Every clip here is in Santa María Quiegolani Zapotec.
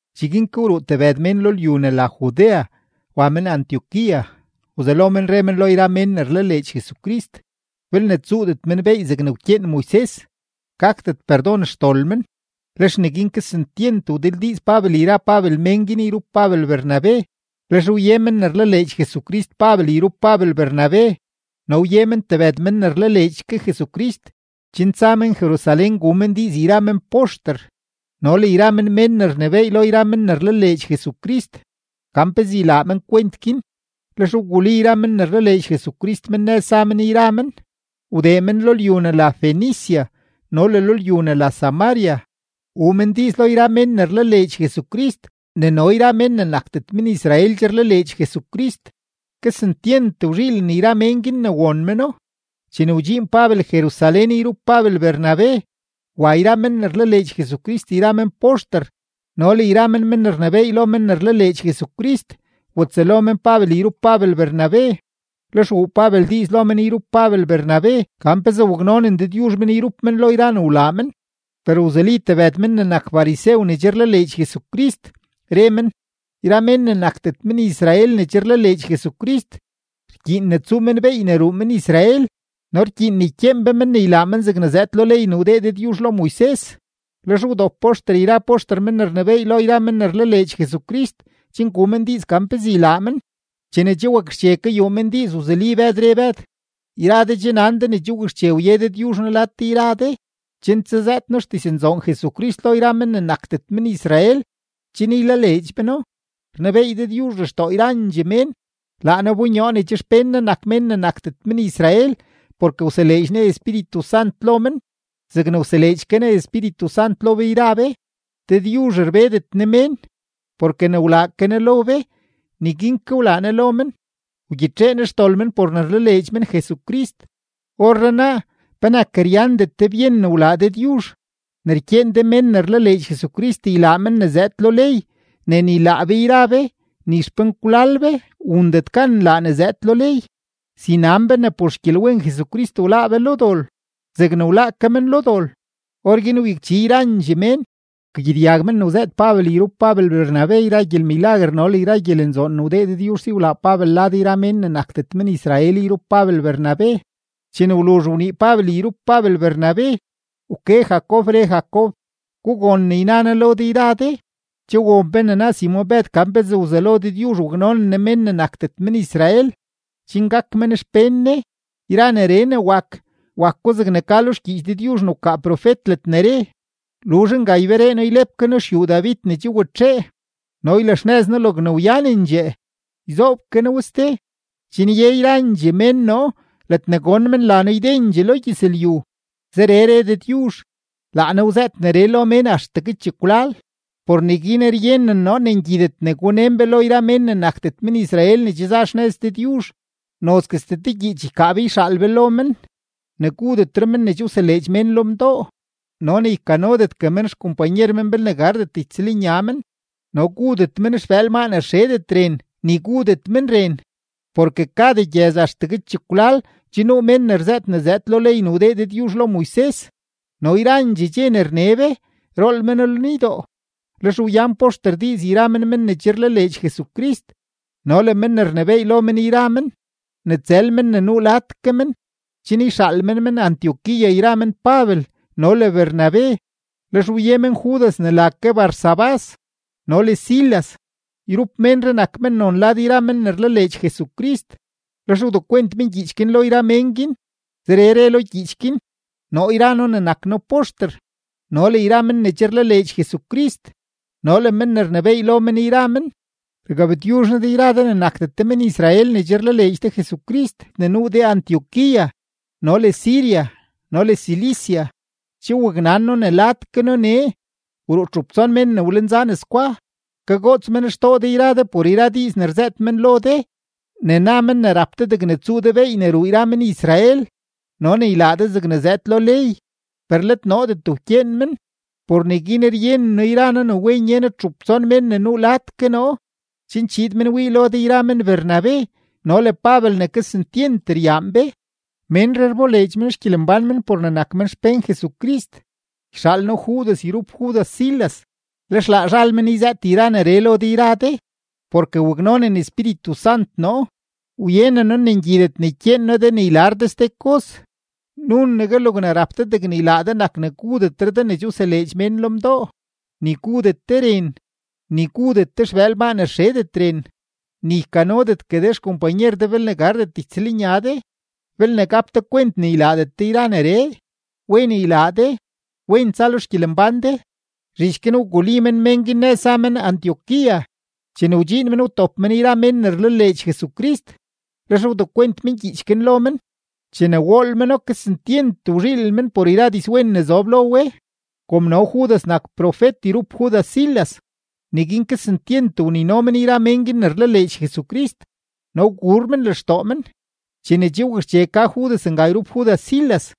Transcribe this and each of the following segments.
Cheguin ke wruu tebëd mén lo lyu ne la Judea wa men Antioquía, wzelo men re men lo yra mén ne rlaleedx Jesucrist, belne tsuudet men beey zegne wkyeen Moises, gakdet perdon xdol men. Lex neguin kesentyent wdildiiz Pabel yra mén guin yrup Pabel Bernabe. Lex wye men ne rlaleedx Jesucrist Pabel yrup Pabel Bernabe no wye men tebëd men ne rlaleedx ke Jesucrist chen tsa men Jerusalén gu men diiz yra men poxter no le yra men mén ne rnebééy lo yra men ne rlaleedx Jesucrist gan pezee ylaa men kwent guin. Lex wguli yra men ne rlaleedx Jesucrist men nëz za men yra men, wdee men lo lyu ne la Fenicia no le lo lyu ne la Samaria, wuu men diiz lo yra men ne rlaleedx Jesucrist ne no yra mén ne nakdet men-Israel che rlaleedx Jesucrist. Kesentyent wzhiilen yra mén guin ne won meno. Chene wdxiin Pabel Jerusalén yrup Pabel Bernabe, wa yra men ne rlaleedx Jesucrist yra men poxter no le yra men ne rnebééy lo men ne rlaleedx Jesucrist watsëlo men Pabel yrup Pabel Bernabe. Lex wuu Pabel diiz lo men yrup Pabel Bernabe gan pezee waknonen Dëdyuzh men yrup men lo yra ne wlaa men. Per wzuli tebëd men ne nak farisew ne che rlaleedx Jesucrist, re men: ―Yra mén ne nakdet men-Israel ne che rlaleedx Jesucrist, rkyiin ne tsuu men beey ne ruu men-Israel no rkyiin ne ykyeen be men ne ylaa men zegne zëëd lo ley ne wdee Dëdyuzh lo Moises. Lex wdop poxter yra poxter mén ne rnebééy lo yra men ne rlaleedx Jesucrist chen gu men diiz gan pezee ylaa men. Chene che wakxche kayuu men diiz, wzuli Bëd, re Bëd: ―Yra de che nan de ne che wakxche wye Dëdyuzh noo lad de yra de, chen tsazëët noo xdiznzoon Jesucrist lo yra mén ne nakdet men-Israel chen ylaleedx meno. Rnebeey Dëdyuzh lextoo yrandxee mén, laa Ne wbonyoo ne che xpén Ne nak mén ne nakdet men-Israel porke wseleedx Ne Espíritu Sant lo men zegne wseleedx ke Ne Espíritu Sant lo be yra be. Dëdyuzh rbedet Ne mén, porke ne wlaa ke Ne lo be, neguin ke wlaa Ne lo men, wgyitxee Ne xdol men por ne rlaleedx men Jesucrist. Orrenaa, ¿penak ryandet de byen ne wlaa Dëdyuzh, ne rkyeen de men ne rlaleedx Jesucrist ylaa men ne zëëd lo ley ne ni laa be yra be ni xpenkwlal be wundet gan nlaa ne zëëd lo ley? Si nan be ne por xgyelwen Jesucrist wláá be lo dol zegne wláá ke men lo dol. Orguin wyakchi yrandxee mén, wkagyedyag men ne wzëët Pabel yrup Pabel Bernabe yra gyelmilaguer no le yra gyelenzoon ne wdee Dëdyuzh si wlaa Pabel lad yra mén ne nakdet men-Israel yrup Pabel Bernabe. Chene wluzh wnii Pabel yrup Pabel Bernabe, wke Jacob, re Jacob: ―Gugon ne yna noo lo de yra de: Che won be ne na Simon-Bëd gan pezee wzelo Dëdyuzh waknonen Ne mén ne nakdet men-Israel, chen gak men xpén Ne. Yra neree ne wak, wako zegne ka lo xgyiich Dëdyuzh ne wkaa profet ledne re: Luzh nga, yberee noo ylep ke noo xyuu David ne che watxee, no ylaxnëz noo logne wyanendxee, yzoob ke noo we ste chen ye yrandxee mén noo ledne gon men la noo ydendxee lo gyëzlyu. Zeree re Dëdyuzh, laa Ne wzëët neree lo mén axtegue chekwlal. ’Por neguin ryenen noo ne ngyidet ne gunen be lo yra mén ne nakdet men-Israel ne che za xnëz Dëdyuzh. Nozguestee te gyiich ykaa be yxaal be lo men, ne gudetre men ne che wseleedx mén lo mdoo, no ne ykanodetgue men xkompanyer men belne gardet ytsëlnya men, no gudet men xbëël maa ne rxedet ren, ni gudet men ren. Porke kada gyëz axtegue chekwlal che nuu mén ne rzëët ne zëëd lo ley ne wdee Dëdyuzh lo Moises no yrandxee dxe ne rne be, rool méno lenydoo. Lex wyan poxter diiz yra men men ne che rlaleedx Jesucrist no le men ne rnebééy lo men yra men, ne tsël men ne nuu lad ke men, chen yxaal men men Antioquía yra men Pabel no le Bernabe. Lex wye men Judas ne la ke Barsabás no le Silas. Yrup ménree nak mennon lad yra men ne rlaleedx Jesucrist. Lex wdekwent men gyiich guin lo yra mén guin; zeree re lo gyiich guin: “Noo yra noo ne nak noo poxter no le yra men ne che rlaleedx Jesucrist no le men ne rnebééy lo men yra men, rgabtyuzh noo de yra de ne nakdet de men-Israel ne che rlaleedx de Jesucrist ne nuu de Antioquía no le Siria no le Cilicia. Che waknan noo ne lad ke noo nee, wruu txup tson men ne wlenza nes gwa, kagoots men xtoo de yra de por yra diiz ne rzëët men lo de ne na men ne rap de degne tsuu de beey ne ruu yra men-Israel no ne ylaa de zegne zëëd lo ley, per let noodet wkyeen men. Por neguin ryenen noo yra noo ne wen ye noo txup tson mén ne nuu ke lad noo, chen chiid men wii lo de yra men Bernabe no le Pabel ne kesentyent ryaan be. Ménree rboleedx men xgyelembán men por ne nak men xpén Jesucrist. Yxaal noo Judas yrup Judas Silas, lex laa zhal men yzëët yra neree lo de yra de. Porke waknonen Espíritu Sant noo, wyenen noo ne ngyidet ne ykyeen noo de ne ylar de ste kos, nunegue logne rap de degne ylaa de nak ne gudetre de ne che wseleedx mén lo mdoo, ni gudet de ren, ni gudet de xbëël maa ne rxedet ren, ni ykanodetgue de xkompanyer de belne gardet ytsëlnya de. Belne gap de kwent ne ylaadet de yra neree, wen ylaa de. Wen tsa lo xgyelembán de.” Zhich guin wguli men mén guin nëz za men Antioquía. Chene wdxiin men, wtop men yra men ne rlaleedx Jesucrist, lex wdekwent men gyiich guin lo men. Chene wool meno, kesentyent wzhiilen men por yra dizwen ne zob lo we. Kom no Judas nak profet yrup Judas Silas, neguin kesentyent wnino men yra mén guin ne rlaleedx Jesucrist no wguur men lextoo men. Chene che wakxche ka Judas nga yrup Judas Silas,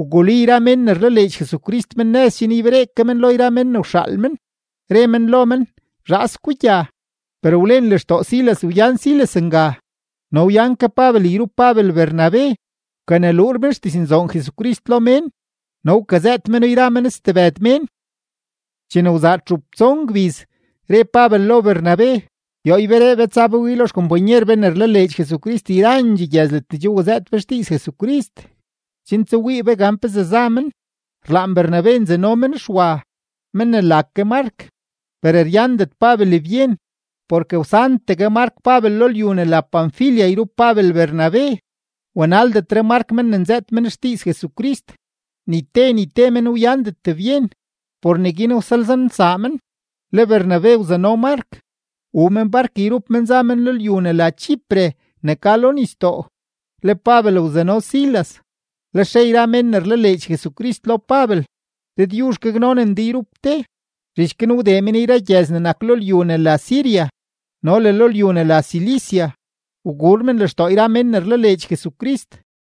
wguli yra men ne rlaleedx Jesucrist men nëz chen yberee ke men lo yra men ne wxaal men, re men lo men: “Zhaas gugya.” Per wlen lextoo Silas wyan Silas nga. No wyan ke Pabel yrup Pabel Bernabe, wkaneluur men xdiznzoon Jesucrist lo mén no wkazëët meno yra men stebëd mén. Chene wzaa txup tson gbiz, re Pabel lo Bernabe: ―Yoo yberee be tsa be wii lo yra xkompanyer be ne rlaleedx Jesucrist yrandxee gyëz ledne che wazëët be xdiiz Jesucrist, chen tsawii be gan pezee za men. Rlaan Bernabe nzano men Xwa, men ne la ke Mark; per ryandet Pabel byen, porke wsantegue Mark Pabel lo lyu ne la Panfilia yrup Pabel Bernabe, wanaldetre Mark men ne nzëët men xdiiz Jesucrist. Ni te ni te men wyandet byen. Por neguin wsalzaanelsaa men; le Bernabe wzano Mark, wuu men bark yrup men za men lyu ne la Chipre ne ka lo nisdoo, le Pabel wzano Silas; lex re yra mén ne rlaleedx Jesucrist lo Pabel: ―Dëdyuzh gaknonen de yrup de. Zhich guin wdee men yra gyëz ne nak lo lyu ne la Siria no le lo lyu ne la Cilicia, wguur men lextoo yra mén ne rlaleedx Jesucrist.